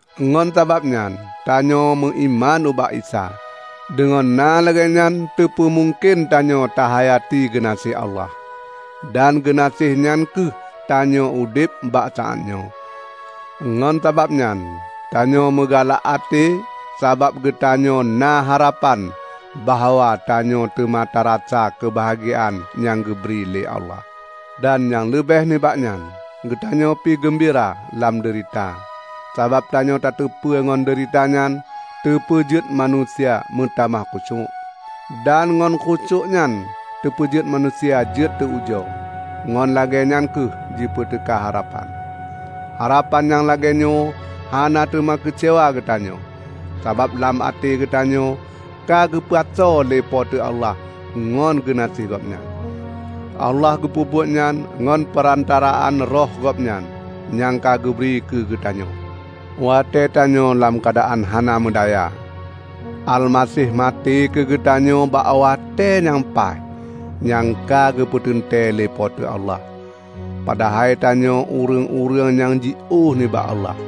Ngon sabab nyan tanyoe meuiman ubak Isa. Deungon na lagée nyan teupeu mungken tanyoe tahayati geunaséh Allah, dan geunaséh nyan kheueh tanyoe udeb bak saát nyoe. Ngon sabab nyan tanyoe meugalak até sabab geutanyoe na harapan bahwa tanyoe teuma tarasa keubahgiaan nyang geubri lé Allah! Dan nyang leubeh nibak nyan, geutanyoe pi geumbira lam deurita, sabab tanyoe tateupeue ngon deurita nyan teupeujeuet manusia meutamah khusyuék, dan ngon khusyuék nyan teupeujeuet manusia jeuet teu-ujoe; ngon lagée nyan kheueh jipeuteuka harapan. Harapan nyang lagée nyoe hana teuma keucewa geutanyoe, sabab lam até geutanyoe ka geupasoe lé Po teu Allah ngon geunaséh Gobnyan. Allah geupeubuet nyan ngon peurantaraan Roh Gobnyan, nyang ka geubri keu geutanyoe. Watée tanyoe lam keuadaan hana meudaya, Almaseh maté keu geutanyoe bak watée nyang paih nyang ka geupeuteuntée lé Po teu Allah; padahai tanyoe ureuëng-ureuëng nyang jiôh nibak Allah.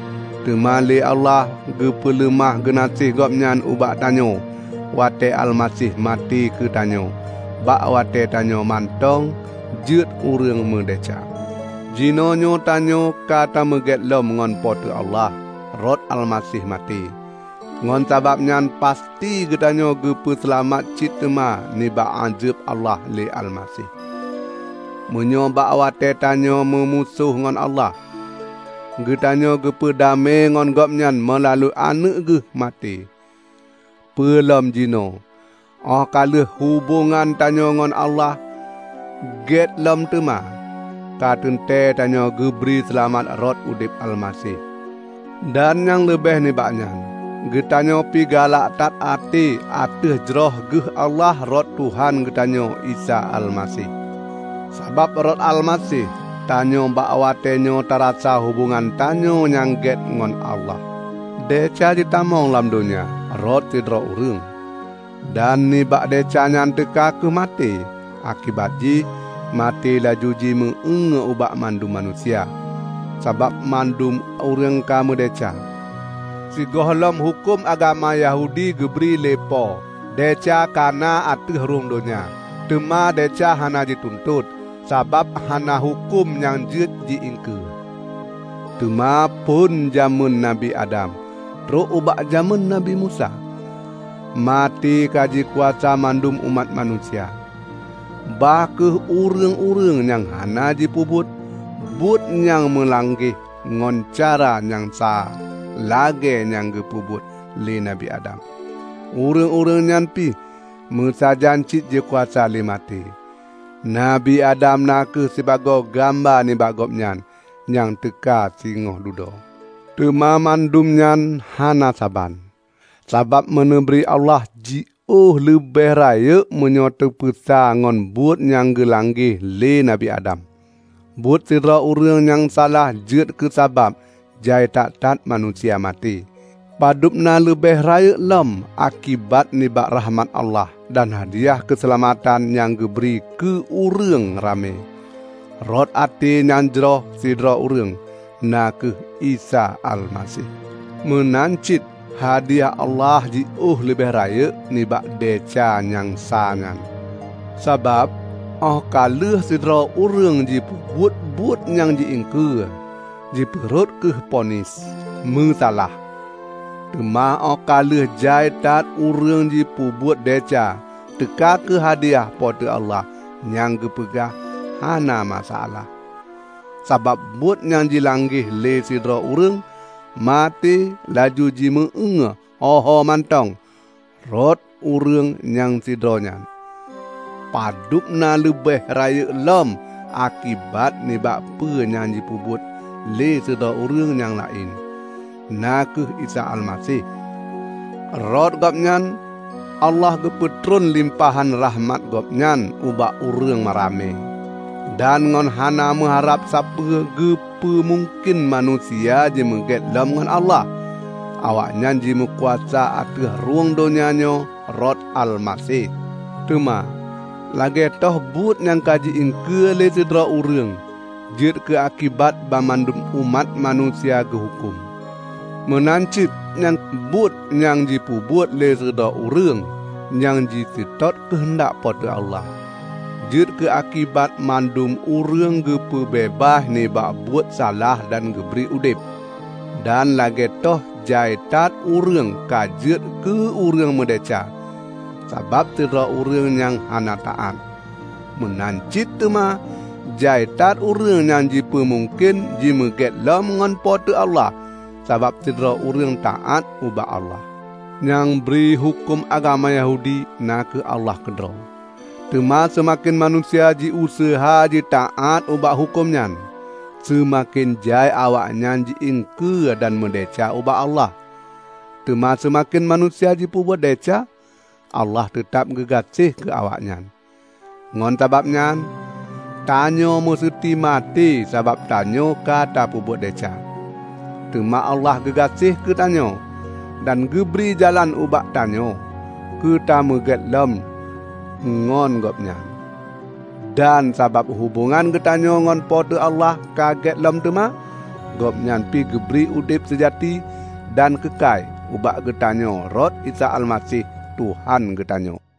Teuma lé Allah geupeuleumah geunaséh Gobnyan ubak tanyoe watée Almaseh maté keugeutanyoe bak watée tanyoe mantong jeuet ureuëng meudesya. Jinoenyoe tanyoe ka tameugét lom ngon Po teu Allah rot Almaseh maté; ngon sabab nyan pasti geutanyoe geupeu seulamat cit teuma nibak ázeb Allah lé Almaseh. Meunyoe bak watée tanyoe meumusoh ngon Allah, geutanyoe geupeu damé ngon Gobnyan meulalu Aneuëk geuh maté, peulom jinoenyoe óh ka lheueh hubongan tanyoe ngon Allah gét lom teuma, ka teuntée tanyoe geubri seulamat rot udeb Almaseh. Dan nyang leubeh nibak nyan, geutanyoe pi galak that até ateueh jroh geuh Allah rot Tuhan geutanyoe Isa Almaseh. Sabab rot Almaseh, tanyoe bak watéenyoe tarasa hubongan tanyoe nyang gét ngon Allah. Desya jitamong lam donya rot sidroe ureuëng, dan nibak desya nyan teuka kheueh maté. Akibat jih, maté laju jimeu-éue ubak mandum manusia, sabab mandum ureuëng ka meudesya. Sigohlom huköm agama Yahudi geubri lé Po, desya ka na ateueh rhueng donya. Teuma desya hana jituntot, sabab hana huköm nyang jeuet ji-iengkeue. Teuma, phon jamén Nabi Adam trok ubak jamén Nabi Musa, maté ka jikuasa mandum umat manusia. Bah kheueh ureuëng-ureuëng nyang hana jipeubuet buet nyang meulanggeh ngon cara nyang sa lagée nyang geupeubuet lé Nabi Adam, ureuëng-ureuëng nyan pih meusajan cit jikuasa lé maté. Nabi Adam na kheueh sibagoe gamba nibak Gobnyan nyang teuka singoh dudoe. Teuma mandua nyan hana saban; sabab meuneubri Allah jiôh leubeh rayeuk meunyoe teupeusa ngon buet nyang geulanggeh lé Nabi Adam. Buet sidroe ureuëng nyang salah jeuet keusabab jai that-that manusia maté. Padub na leubeh rayeuk lom akibat nibak rakhmat Allah dan hadiah keuseulamatan nyang geubri keu ureuëng ramé, rot até nyang jroh sidroe ureuëng, na kheueh Isa Almaseh. Meunan cit hadiah Allah jiôh leubeh rayeuk nibak desya nyang sa nyan. Sabab óh ka lheueh sidroe ureuëng jipeubuet buet nyang ji-iengkeue, jipeurhot kheueh ponis, "Meusalah". Teuma óh ka lheueh jai that ureuëng jipeubuet desya teuka kheueh hadiah Po teu Allah nyang geupeugah, "Hana meusalah". Sabab buet nyang jilanggeh lé sidroe ureuëng, maté laju jimeu-éue ho-ho mantong rot ureuëng nyang sidroe nyan. Padub na leubeh rayeuk lom akibat nibak peue nyang jipeubuet lé sidroe ureuëng nyang laén, na kheueh Isa Almaseh. Rot Gobnyan, Allah geupeutreun limpahan rakhmat Gobnyan ubak ureuëng ramé, dan ngon hana meuharab sapeue geupeu mungken manusia jimeugét lom ngon Allah; awaknyan jimeukuasa ateueh rhueng donya nyoe rot Almaseh. Teuma, lagée toh buet nyang ka ji-iengkeue lé sidroe ureuëng jeuet keu akibat banmandum umat manusia geuhuköm, meunan cit ngon buet nyang jipeubuet lé sidroe ureuëng nyang jiseutôt keuheundak Po teu Allah, jeuet keuakibat mandum ureuëng geupeubeubaih nibak buet salah dan geubri udeb. Dan lagée toh jai that ureuëng ka jeuet keu ureuëng meudesya sabab sidroe ureuëng nyang hana taát, meunan cit teuma jai that ureuëng teupeumungken jimeugét lom ngon Po teu Allah sabab sidroe ureuëng taát ubak Allah. Nyang bri huköm agama Yahudi na kheueh Allah keudroe. Teuma seumaken manusia jiuseuha jitaát ubak huköm nyan, seumaken jai awaknyan ji iengkeue dan meudesya ubak Allah. Teuma seumaken manusia jipeubuet desya, Allah teutab geugaséh keu awaknyan. Ngon sabab nyan, tanyoe museuti maté sabab tanyoe ka tapeubuet desya. Teuma Allah geugaséh keu tanyoe dan geubri jalan ubak geutanyoe keu tameugét lom teuma ngon Gobnyan. Dan sabab hubongan geutanyoe ngon Po teu Allah ka gét lom teuma, Gobnyan pi geubri udeb seujati dan keukai ubak geutanyoe rot Isa Almaseh, Tuhan geutanyoe.